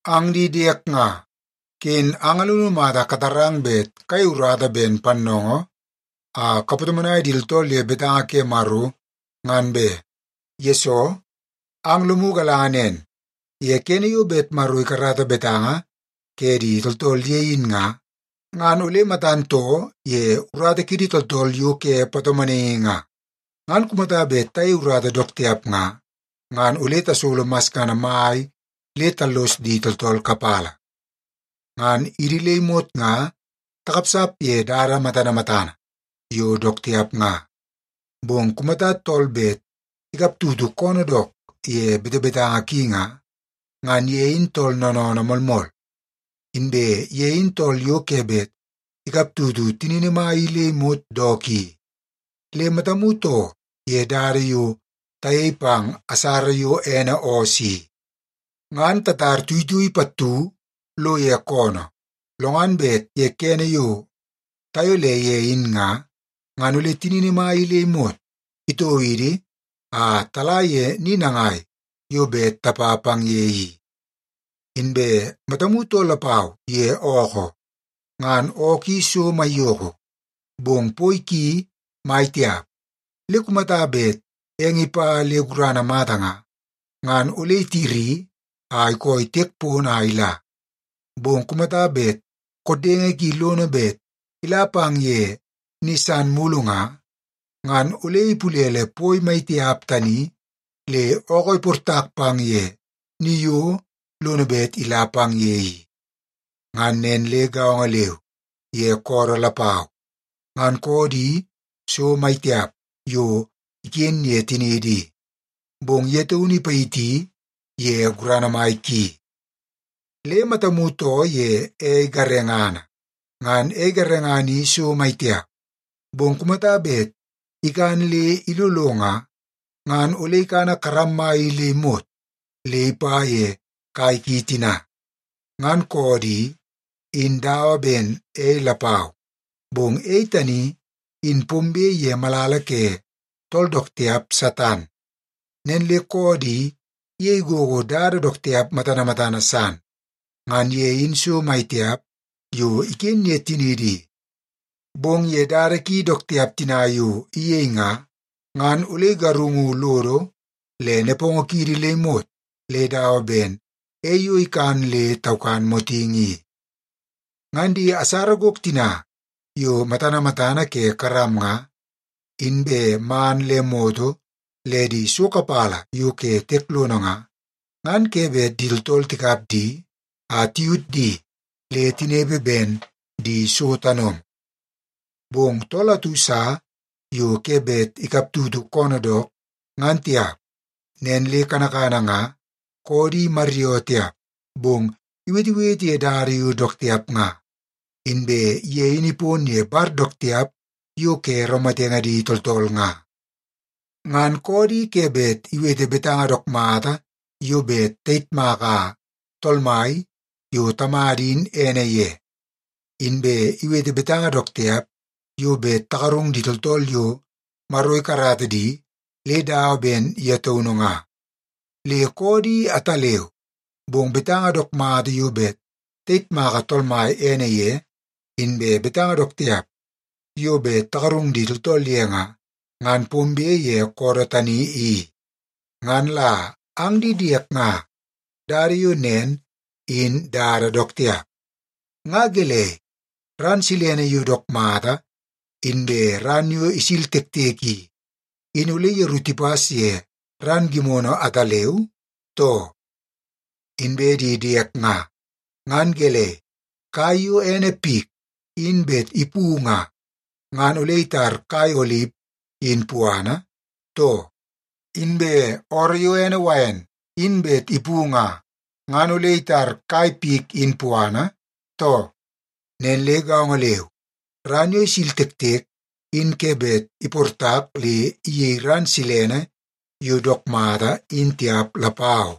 Ang di diek nga, ken ang alunu mata katarang bet kayei urata ben pannoongoo a kapatomonai di tooltool ye betanga ke Maro, ngan be. Yesoo, ang lomu galanga nen, ye kene yo bet Maro ikarata betanga ke di tooltool ye in nga, ngan ole matan too ye urata kiidi tooltool yo ke patomonaingi nga. Ngan kumata bet tayei urata dook tiap nga, ngan ole tasolo masngana mai le tallos di tooltool kapala. Ngan idi le imot nga takapsap ye dada matana matana yo dook tiap nga. Bong kumata tool bet ikaptutu koonoo dook ye betebetanga ki nga, ngan ye in tool noonoonoo moolmool, inbe ye in tool yo ke bet ikaptutu tinini mai i le imot dook i. Le matamu too ye dada yo tayei pang asara yo ene oos i. Ngan tatar tuitui pattu lo ye koonoo, lo ngan bet ye kene yo tayole ye in nga, ngan ole tinini mai i le imot itoo idi a tala ye ni nangai yo bet tapa pang ye i. Inbe matamu too lapau ye ookoo. Ngan ookoo i so maiyoko, bong poi ki mai tiap. Le kumata bet eng ipa le gurana mata nga, ngan ole itiri a ikooi tiek pono a ila. Bong kumata bet koddenge ki lono bet ila pang ye ni san mulu nga, ngan ole ipulele poi mai tiap tani le ookoo iportak pang ye ni yo lono bet ila pang ye i. Ngan nen le gaongo leu ye koodoo lapau. Ngan koodoo i so mai tiap yo iken ye tiniidi i, bong ye taunu ipayiti ye gurana mai ki. Le matamu too ye ei garengana. Ngan ei garengana i so mai tiap, bong kumata bet ikan le ilolo nga, ngan ole ikana karam mai i le imot le ipa ye kai ki tina. Ngan koodoo i, in dawa ben ei lapau, bong ei tani in pombe ye malala ke tool dook tiap Satan. Nen le koodoo i iyei gogo dada dook tiap matana matana san. Ngan ye in so mai tiap yo iken ye tiniidi i, bong ye dada ki dook tiap tina yo iyei nga, ngan ole igarungu lodo le nepongo kiidi le imot le dawa ben ei yo ikan le taukan motingi i. Ngan di asara gok tina yo matana matana ke karam nga, inbe man le moto le di so kapala yo ke tiek lono nga, ngan ke bet di tooltool tikap di a tiyut di le tinepe ben di so tanomo. Bong tool atu sa yo ke bet ikaptutu koonoo dook, ngan tiap. Nen le kanakana nga, koodoo i imaryoo tiap, bong iwetewete ye dada yo dook tiap nga. Inbe ye in ipon ye bar dook tiap yo ke raumatenge di tooltool nga. Ngan koodoo i ke bet iwete betanga dook mata yo bet tayitmaka Tool Mai yo Tamada in ene ye, inbe iwete betanga dook tiap yo bet tagarung di tooltool yo Maro ikarata di le dawa ben ye taunu nga. Le koodoo i ataleu, bong betanga dook mata yo bet tayitmaka Tool Mai ene ye, inbe betanga dook tiap yo bet tagarung di tooltool ye nga, ngan pombe ye koodoo tani i. Ngan la ang di diek nga, dada yo nen in dada dook tiap. Nga gelei, ran silene yo dook mata inbe ran yo isil tektek i, in ole yeru tipas ye ran gimono ataleu, too? Inbe di diek nga, ngan gelei, kai yo ene pik in bet ipu nga, ngan ole itar kai olip in puana, too? Inbe ooroo yo ene wain in bet ipu nga, ngan ole itar kai pik in puana, too? Nen le gaongo leu, ran yo isil tektek in ke bet iportak le iyei ran silene yo dook mata in tiap lapau.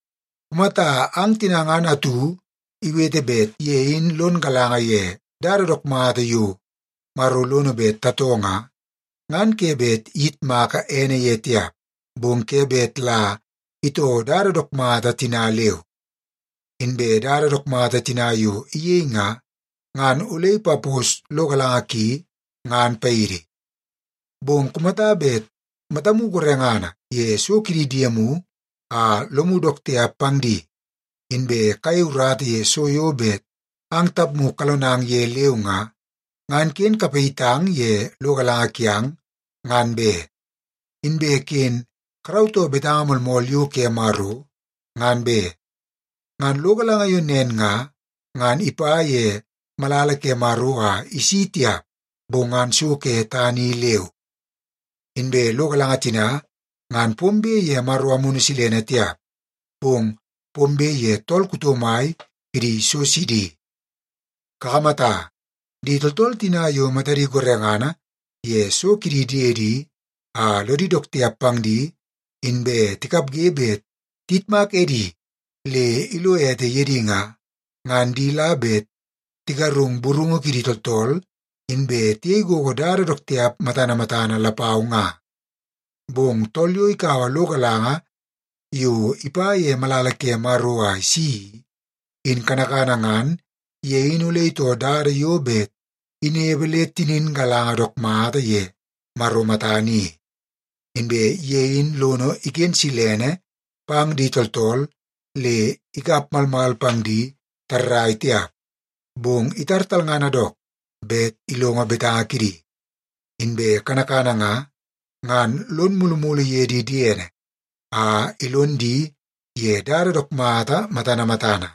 Kumata ang tina ngan atu iwete bet ye in lon galanga ye dada dook mata yo Maro lono bet tatoo nga, ngan ke bet iyitmaka ene ye tiap, bong ke bet la itoo dada dook mata tina leu. Inbe dada dook mata tina yo iyei nga, ngan ole ipapos lo galanga ki ngan paidi. Bong kumata bet matamu gorengana ye so kidi diemu a lomu dook tiap pang di, inbe kayei urata ye so yo bet ang tapmu kalonang ye leu nga, ngan ken kapayitang ye lo galanga kiang, ngan be. Inbe ken karautoo betanga moolmool yo ke Maro, ngan be. Ngan lo galanga yo nen nga, ngan ipa ye malala ke Maro a isi tiap, bong ngan so ke tana i leu. Inbe lo galanga tina ngan pombe ye Maro Amunu Silene tiap, bong pombe ye tool kuto mai kidi so sidi. Kakamata, di tooltool tina yo matadi gorengana ye so kidi diedi a lodi dook tiap pang di inbe tikapge bet tiyitmak edi le ilo ete ye di nga, ngan di la bet tigarung burungu kidi tooltool inbe tiyei gogo dada dook tiap matana matana lapau nga. Bong tool yo ikaua lo galanga yo ipa ye malala ke Maro a isi i, in kanakana ngan ye in ole itoo dada yo bet inepe le tinin galanga dook mata ye Maro matana i. Inbe ye in lono iken silene pang di tooltool le ikap malmal pang di tarrai tiap, bong itar talngana dook bet ilongo betanga kidi. Inbe kanakana nga, ngan lono mulumulu ye di diene a ilon di ye dada dook mata matana matana.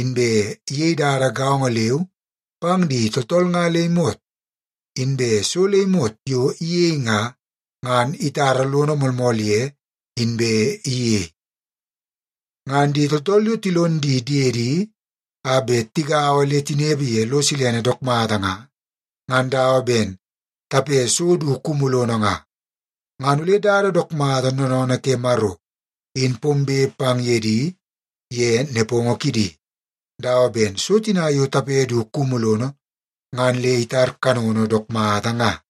Inbe iyei dada gaongo leu pang di tooltool nga le imot. Inbe so le imot yo iyei nga, ngan itara lono moolmool ye inbe iyei. Ngan di tooltool yo tilon di diedi a bet tigaua le tinepe ye lo silene dook mata nga, ngan dawa ben tape so du kumu lono nga. Ngan ole dada dook mata noonoonoo ke Maro in pombe pang ye di ye nepongo kidi, dawa ben so tina yo tape du kumu lono, ngan le itar kanono dook mata nga.